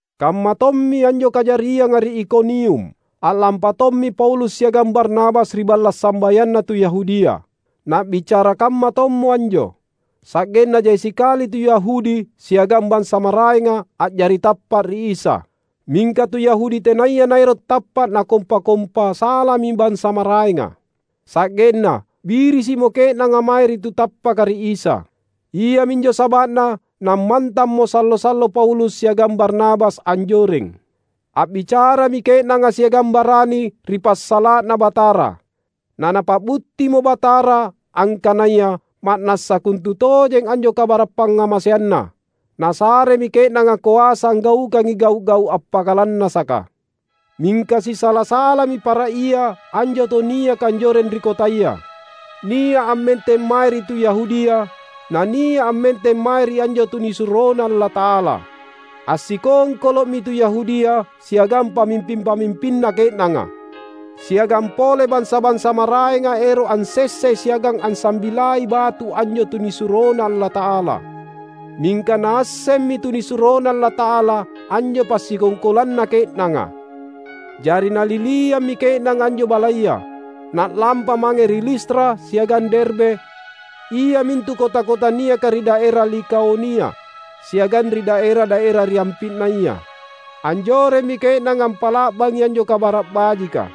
Kammatommi anjo kajarianga ri Ikonium. A’lampa tommi Paulus siagang Barnabas ri balla’ sambayanna tu Yahudia; na’bicara kamma tommo anjo, sa’genna jai sikali tu Yahudi siagang bansa maraenga a’jari tappa’ ri Isa. Mingka tu Yahudi tenaya naero’ tappa’ nakompa-kompa salami bansa maraenga, sa’genna birisi’mo ke’nanga mae ri tu tappaka ri Isa. Iaminjo saba’na nammantammo sallo-sallo Paulus siagang Barnabas anjoreng. A’bicarami ke’nanga siagang barani ri passala’na Batara. Na Napa’buttimo Batara angkanaya ma’nassa kontutojengi anjo kabara’ pangngamaseanNa; Nasaremi ke’nanga koasa anggaukangi gau’-gau’ appakalannasaka. Mingka sisala-salami para ia anjo tau niaka anjoreng ri kotaya; nia’ ammenteng mae ri tu Yahudia na nia’ ammenteng mae ri anjo tunisuroNa Allata’ala. Assikongkolo’mi tu Yahudia siagang pamimping-pamimpinna ke’nanga, siagang pole bansa-bansa maraenga ero’ ansessai siagang ansambilai batu anjo tunisuroNa Allata’ala. Mingka naassemmi tunisuroNa Allata’ala anjo passikongkolanna ke’nanga. Jari naliliammi ke’nanga anjo balaya, na’lampa mange ri Listra siagang Derbe, iamintu kota-kota niaka ri daera Likaonia, siagang ri daera-daera ri ampi’naya. Anjoremmi ke’nanga ampa’la’bangi anjo Kabara’ Bajika.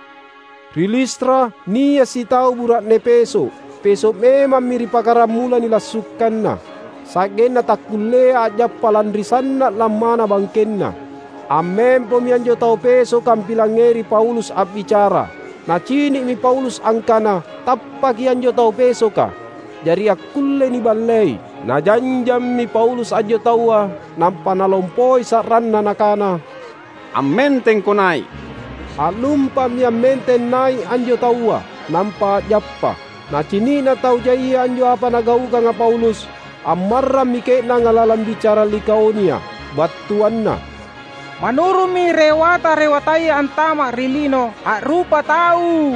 Ri Listra, nia’ sitau bura’ne peso’. Peso’ memammi ri pakaramula nilassukanna, sa’genna takkullea a’jappa lanri sanna’ lammana bangkenna. Ammempomi anjo tau pesoka ampilangngeri Paulus a’bicara. Nacini’mi Paulus angkana tappaki anjo tau pesoka, jari akkullei niballei. Najanjammi Paulus anjo taua, nampa nalompoi sa’ranna nakana, "Ammentengko nai’!" A’lumpa’mi ammenteng nai’ anjo taua, nampa a’jappa. Nacini’na tau jaia anjo apa nagaukanga Paulus, ammarrammi ke’nanga lalang bicara Likaonia, battuanna, "Manurummi rewata-rewataya antama’ ri lino, a’rupa tau."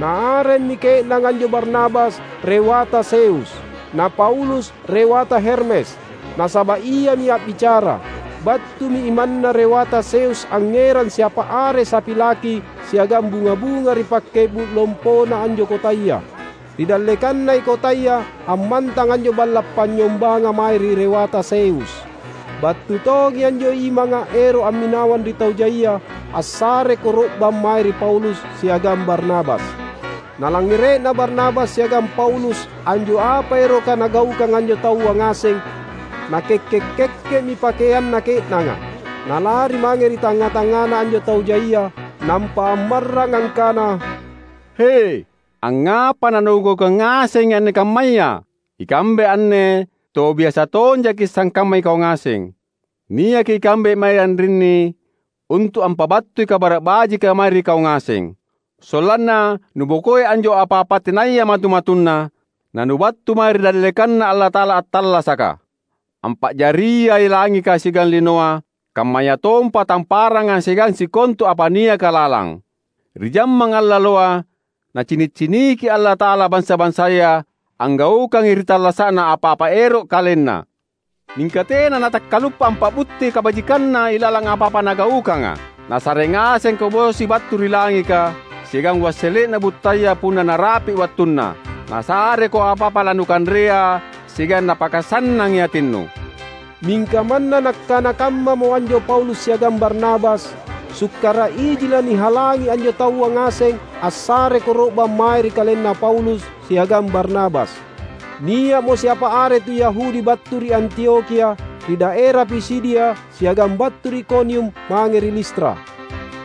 Naaremmi ke’nanga anjo Barnabas Rewata Zeus; na Paulus Rewata Hermes, nasaba’ iami a’bicara. Battumi imanna Rewata Zeus angngerang siapa are sapi laki siagang bunga-bunga ri pakke’bu’ lompona anjo kotaya. Ri dallekannai kotaya ammantang anjo balla’ panynyombanga mae ri Rewata Zeus. Battu tongi anjo imanga ero’ amminawang ri tau jaia assare koro’bang mae ri Paulus siagang Barnabas. Nalangngere’na Barnabas siagang Paulus anjo apa eroka nagaukang anjo taua ngaseng, nakekke’-kekke’mi pakeanna ke’nanga, nalari mange ri tangnga-tangngana anjo tau jaia, nampa ammarrang angkana, "He, angngapa nanugaukang ngasengi anne kammaya? Ikambe anne tau biasa tonjaki’ sangkamma ikau ngaseng! Niaki ikambe mae anrinni untu’ ampabattui Kabara’ Bajika mae ri kau ngaseng, sollanna nubokoi anjo apa-apa tenaya matu-matunna; na nubattu mae ri dallekanNa Allata’ala attallasaka, ampa’jariai langika siagang linoa, kammayatompa tamparanga siagang sikontu apa niaka lalang. Ri jammang allaloa Nacini’-ciniki Allata’ala bansa-bansaya anggaukangi ri tallasa’na apa-apa ero’ kalenna. Mingka tena Natakkaluppa ampa’butti kabajikanNa ilalang apa-apa Nagaukanga. Nasare ngasengko bosi battu ri langika, siagang wassele’na buttaya punna narapi’ wattunna. Nasareko apa-apa lanukanrea siagang Napakasannangi atinnu." Mingka manna nakkana kammamo anjo Paulus siagang Barnabas, sukkara’ iji lanihalangi anjo taua ngaseng assare koro’bang mae ri kalenna Paulus siagang Barnabas. Nia’mo siapa are tu Yahudi battu ri Antiokhia ri daera Pisidia siagang battu ri Ikonium mange ri Listra.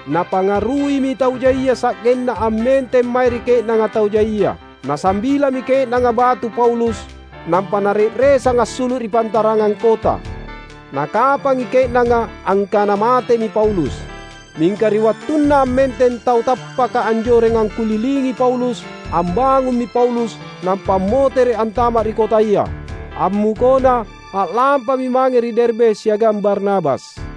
Napangaruimi tau jaia sa’genna ammenteng mae ri ke’nanga tau jaia. Nasambilami ke’nanga batu Paulus nampa nare’resang assulu’ ri pantarangang kota. Nakapangi ke’nanga angkana matemi Paulus. Mingka ri wattunna ammenteng tau tappaka anjoreng angkulilingi Paulus, ambangummi Paulus nampa ammotere’ antama’ ri kotaya. Ammukona, a’lampami mange ri Derbe siagang Barnabas.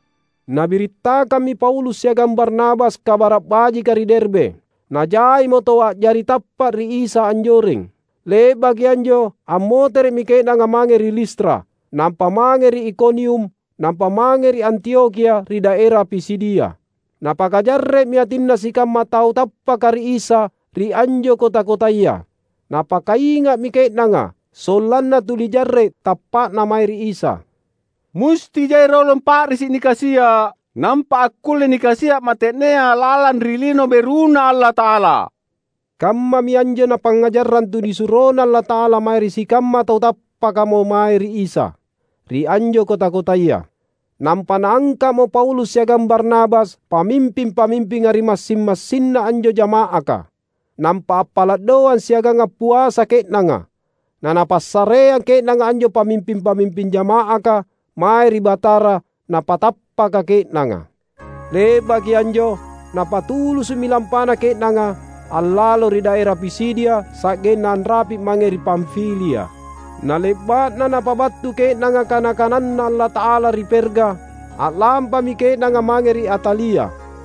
Nabirittakammi Paulus siagang Barnabas Kabara’ Bajika ri Derbe. Najaimo tau a’jari tappa’ ri Isa anjoreng. Le’baki anjo ammotere’mi ke’nanga mange ri Listra, nampa mange ri Ikonium, nampa mange ri Antiokhia ri daera Pisidia. Napakajarre’mi atinna sikamma tau tappaka ri Isa ri anjo kota-kotaya. Napakainga’mi ke’nanga, sollanna tuli jarre’ tappa’na mae ri Isa. "Musti jai rolong pa’risi’ nikasia’, nampa akkulle nikasia’ mate’nea lalang ri Lino BeruNa Allata’ala," kammami anjo napangngajarrang tunisuroNa Allata’ala mae ri sikamma tau tappakamo mae ri Isa, ri anjo kota-kotaya. Nampa naangka’mo Paulus siagang Barnabas pamimping-pamimpinga ri massing-masinna anjo jama’aka. Nampa appala’ doang siagang appuasa ke’nanga, nanapassareang ke’nanga anjo pamimping-pamimping jama’aka mae ri Batara napatappaka ke’nanga. Le’baki anjo, napatulusu’mi lampana ke’nanga, allalo ri daera Pisidia sa’genna anrapi’ mange ri Pamfilia. Na le’ba’na napabattu ke’nanga kana-kananNa Allata’ala ri Perga, a’lampami ke’nanga mange ri Atalia.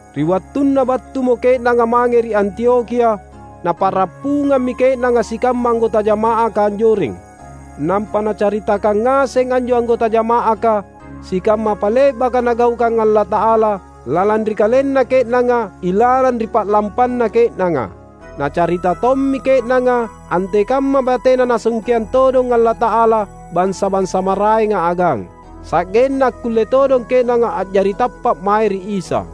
Ri wattunna battumo ke’nanga mange ri Antiokhia, napa’rappungammi ke’nanga sikamma anggota jama’aka anjoreng. Nampa nacaritakang ngaseng anjo anggota jama’aka sikamma apa le’baka Nagaukang Allata’ala lalang ri kalenna ke’nanga ilalang ri pa’lampanna ke’nanga. Nacarita tommi ke’nanga antekamma batena Nasungkeang todong Allata’ala bansa-bansa maraenga agang, sa’genna akkulle todong ke’nanga a’jari tappa’ mae ri Isa.